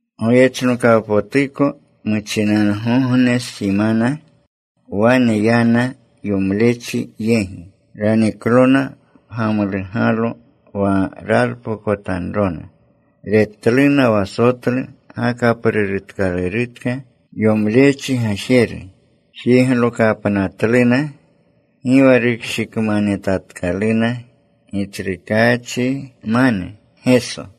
Goyechnokawpotuko muchinangogne simana wane yana yomlechi yegi. Raniklona pgamlugalo wa ralpokotanrona. Retluna wa sotlu gakaprurutkalurutka yomlechi gajeru. Jiglokapnatluna. Gi wa rukshikmanetatkaluna Gitsrukaachmane Geso.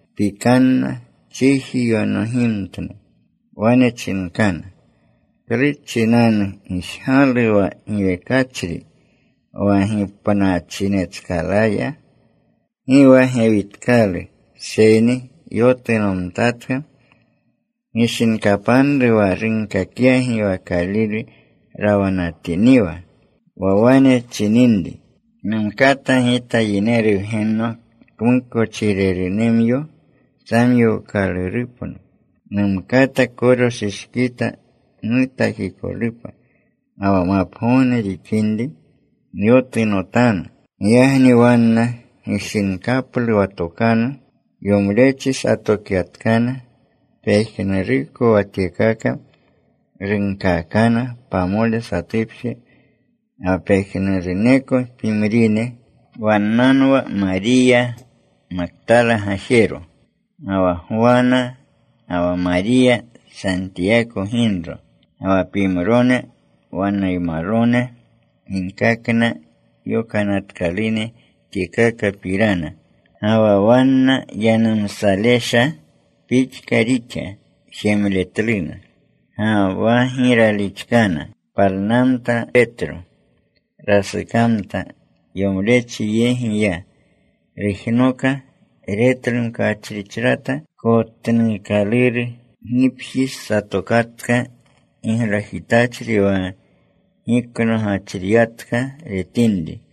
Pikanna. Chiji yonogimtna. Wane chinkana, “¿Klu chinanu gijgalu wa giwekachri wa gipnachinetskalaya? Gi wa gewitkalu seyni yotunomtatka. Gishinkapanru wa runkakyagi wa Kalile rawanatiniwa, wa wane chininri, ‘Numkata Gita, Yineru Wgenno kmukochirerunemyo samyookalurupno. Numkata koroshishkita nutakikolupa, ga wa mapgogne rixinri nyotunotanu.’” Giyagni wanna gishinkaplu wa tokanu. Yomlechi satokyatkana. Pejnuruko wa tyekaka runkaakana pamole satupje ga wa pejnuruneko pimrine. Wannanwa Mariya Maktala gajero, ga wa Gwana, ga wa Mariya Santiyako ginro, ga wa pimrone wannaymalone ginkakna yokanatkalune tyekakapirana. Ga wa wanna yanumsalesha pixka rixa jemletluna. Ga wa gi ralixkana. Palnamta Petro. Rasukamta. Yomlechi yegi ya. Rujnoka. Retlu mkachrichrata kotnuukaluru. Gipji satokatka giglajitachri wa giknogachriyatka retinri.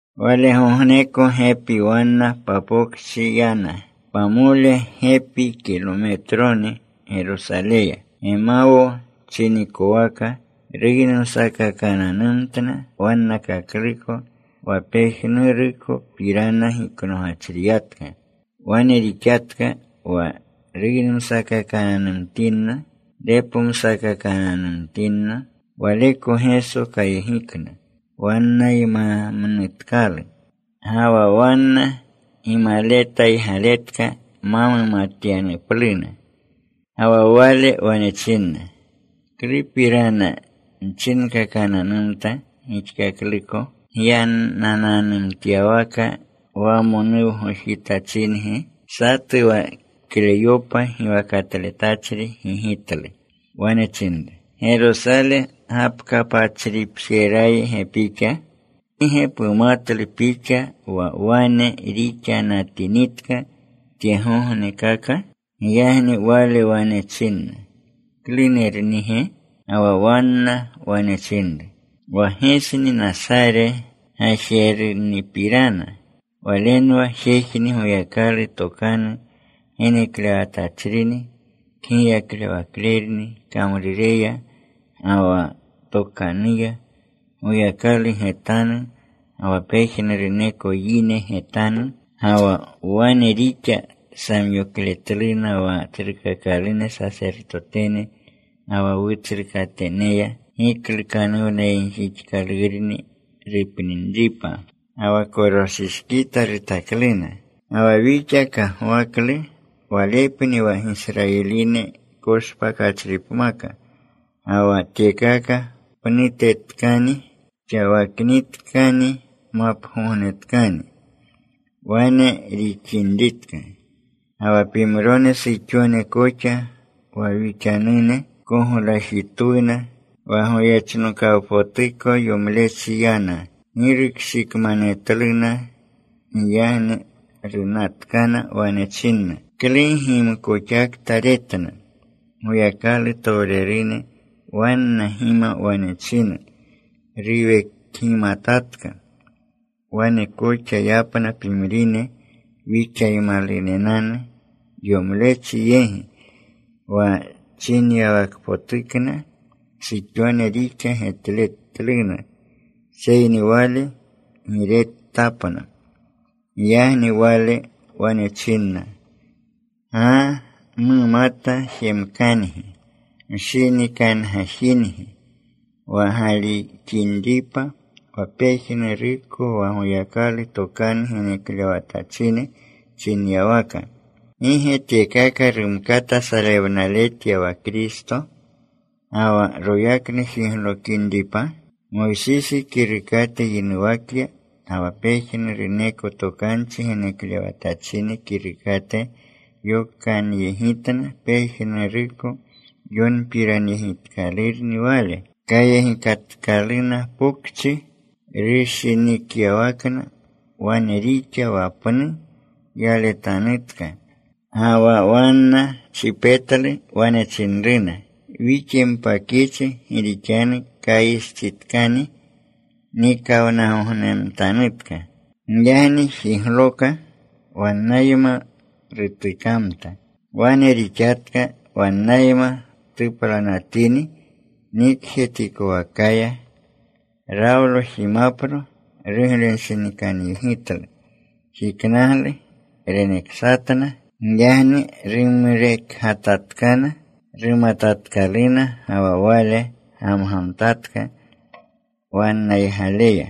Walegogneko gepi wanna papokchi yana. Pamole gepi kilometroni Gerosaleya, Gemawo chinikowaka. Ruynumsakakananumtna wannakakluko wa pejnurukopirana giknogachriyatka. Wane rixatka. Wa ruynumsakakananumtinna, repomsakakananumtinna, Waleko Geso kayegikna. Wannaymamnutkalu. Ga wa wanna gimaletaygaletka ma mumatyanupluna. Ga wa Wale wane chinna, “¿Klupirana nchinkakananumta gixkakluko gyanananumtyawaka wamonuwgojitachingi?” Satu wa Kleyopa giwakatletachri gigitlu. Wane chinru, “¿Gerosale gapkapachripjeraygi pixa? ¿Gi ge pumatlu pixa wa wane rixanatinitka tyegognekaka?” Giyagni Wale wane chinna, “¿Klunernige?” Ga wa wanna wane chinru, “Wa Gesni Nasare gajernipirana. Walenwa jejni Goyakalu tokanu geneklewatachrini. Kgiyaklewaklerni kamrureya ga wa tokanuya, Goyakalu getanu ga wa pejnuruneko yine getanu. Ga wa wane rixa samyokletluna wa tsrukakalune sasertotene, ga wa wutsrukateneya giklukanuwnayegjixkalurni rupninripa. Ga wa koroshishkita rutakluna. Ga wa wixa kagwaklu Walepni wa Gisrayiline koshpakachripmaka. Ga wa tyekaka pnutetkani xawaknitkani mapgognetkani wane rixinritka. Ga wa pimrone suxone koxa wa wixanune koglajitwuna. Wa goyechnokawpotuko yomlechi yana. Gi rukshikmanetluna. Giyagni runatkana. Wane chinna klugimkoxakta retna, Goyakalutowrene. Wanna gima wane china ruwekgimataka. Wane koxa yapna pimrine wixaymalunenanu yomlechi yegi. Wa chinyawakpotukna suxone rixa getletluna. Seyni Wale gi retapna.” Giyagni Wale wane chinna, “Gaa mumata jemkangi. Mshinikangajingi wa galixinripa wa pejnuruko wa Goyakalu tokanu geneklewatachine chinyawaka. ¿Gi ge tyekaka rumkata salewnaletya wa Kristo, ga wa royaknu jiglokinripa?” Moysisi kirukate yinuwakya ga wa pejnuruneko tokanchi geneklewatachine kirukate, yokakyegitna pejnuruko yonpiranyegitkalurni Wale. Kayegikatkaluna pokchi rushinikyawakna. Wane rixa wa pnu yaletanutka. Ga wa wanna chipetlu. Wane chinruna, “Wixyempakyichi, gi rixanu kayistsitkani; nikawnagognemtanutka.” Giyagni jigloka. Wannayma rutukamta. Wane rixatka. Wannayma tuplanatini nikjetikowakaya, rawlo jimapro. Ruglenshinikanyegitlu. Jiknaglu. Reneksatna. Giyagni rumrekgatatkana. Rumatatkaluna. Ga wa Wale gamgamtatka wannaygaleya.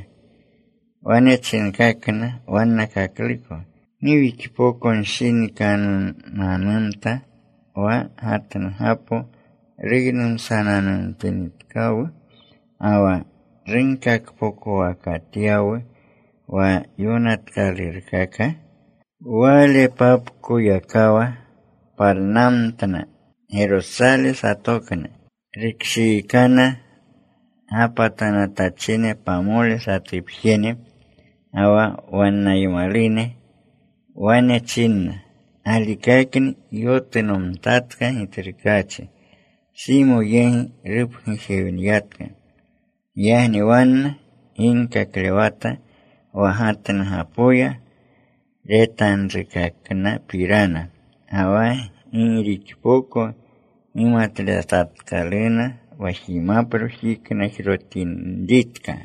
Wane chinkakna wannakakluko, “¿Gi wixpokonshinikanunanumta wa gatnugapo ruynumsananumtinitkawu ga wa runkakpokowakatyawu wa yonatkalurkaka?” Walepapkoyakawa palnamtna. Gerosale satokna. Rukshiikana gapatanatachine pamole satupjene ga wa wannaymalune. Wane chinna, “Galikakni yotunomtatka Gitsrukaachi. Simo yegi rupgujewniyatka.” Giyagni wanna ginkaklewata wa gatnugapoya retanrukaknapirana, ga wa gi rixpoko gimatletatkaluna wa jimapro jiknajrotinritka.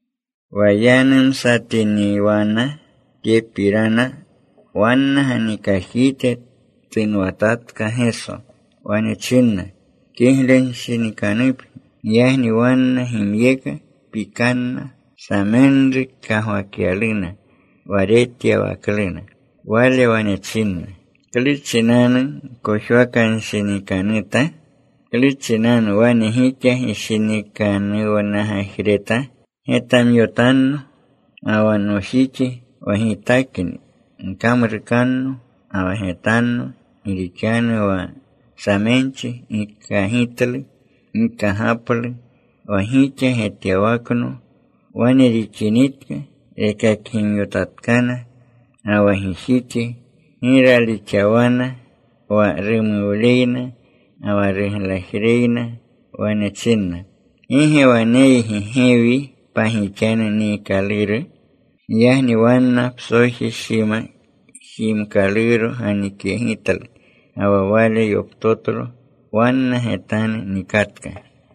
Wa yanumsatiniwana tyepirana, wanna ganikajite tunwatatka Geso. Wane chinna, “Kiglenshinikanupgi.” Giyagni wanna gimyeka. Pikanna. Samenru kagwakyaluna wa retyawakluna. Wale wane chinna, “¿Klu chinanu gkojwakanshinikanuta? ¿Klu chinanu wane gixa gishinikanuwgajreta? Getamyotanno ga wa nojixi, wa Gitakni. Gkamrukanno ga wa getanno. Gi rixanu wa samenchi gi kagitlu, gi kagaplu wa gixa getyawakno.” Wane rixinitka, rekakgimyotatkana ga wa gijixi. Gi ralixawana wa rumuwleyna ga wa ruglajreyna. Wane chinna, “¿Gi ge waneygi gewi pagixanu niikaluru?” Giyagni wanna psoji shima jimkaluro ganikyegitlu. Ga wa Wale yoptotlo. Wanna getanu nikatka.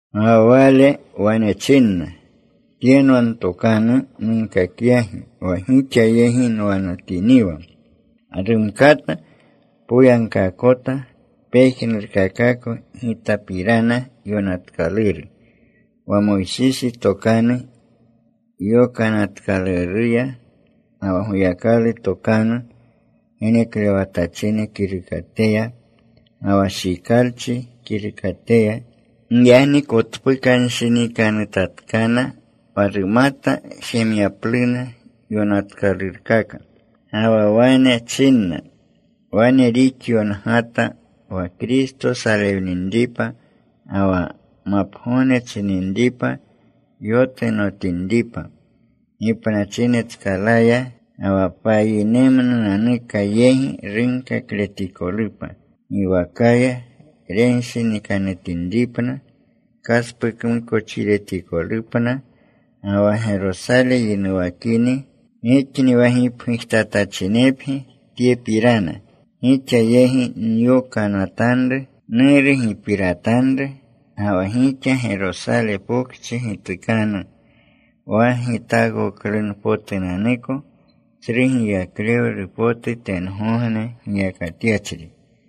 Ga wa Wale wane chinna, “Tyenwa ntokanu nunkakyagi wa gixa yegi nwanatiniwa. Wa rumkata poyagkaakota pejnurkakako Gitapirana yonatkaluru, wa Moysisi Tokanu Yokanatkaluruya, ga wa Goyakalu tokanu geneklewatachine kirukateya, ga wa Shikalchi kirukateya.” Giyagni kotpukanshinikanutatkana wa rumata jemyapluna yonatkalurkaka. Ga wa wane chinna, “Wane rixyongata, wa Kristo salewninripa ga wa mapgogne chininripa yotunotinripa gipnachinetskalaya. Ga wa payinemnunanuka yegi runkakletikolupa giwakaya renshinikanutinripna kaspukmukochiretikolupna. Ga wa Gerosale yinuwakini. Gixni wa gipgujtatachinepgi tyepirana. Gixa yegi nyokanatanru Nuru gipiratanru. Ga wa gixa Gerosale Pokchi gitukanu, wa gitaakoklunpotunanuko tsru giyaklewlu potu tengogne giyakatyachri.”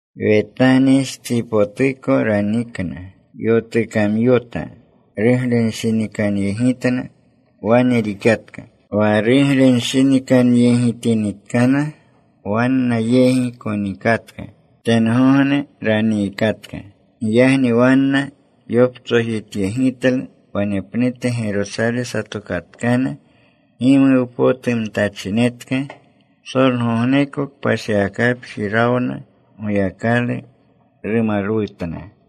Wetanistsipotuko ranikna. Yotukamyota. Ruglenshinikanyegitna. Wane rixatka. Wa ruglenshinikanyeginatinitkana, wanna yegi konikatka. Tengogne raniikatka. Giyagni wanna yoptsojityegitlu. Wanepnute Gerosale satokatkana. Gimuwpotumtachinetka. Psolgogneko kpashiwakapji rawna. Goyakalu rumalwutna.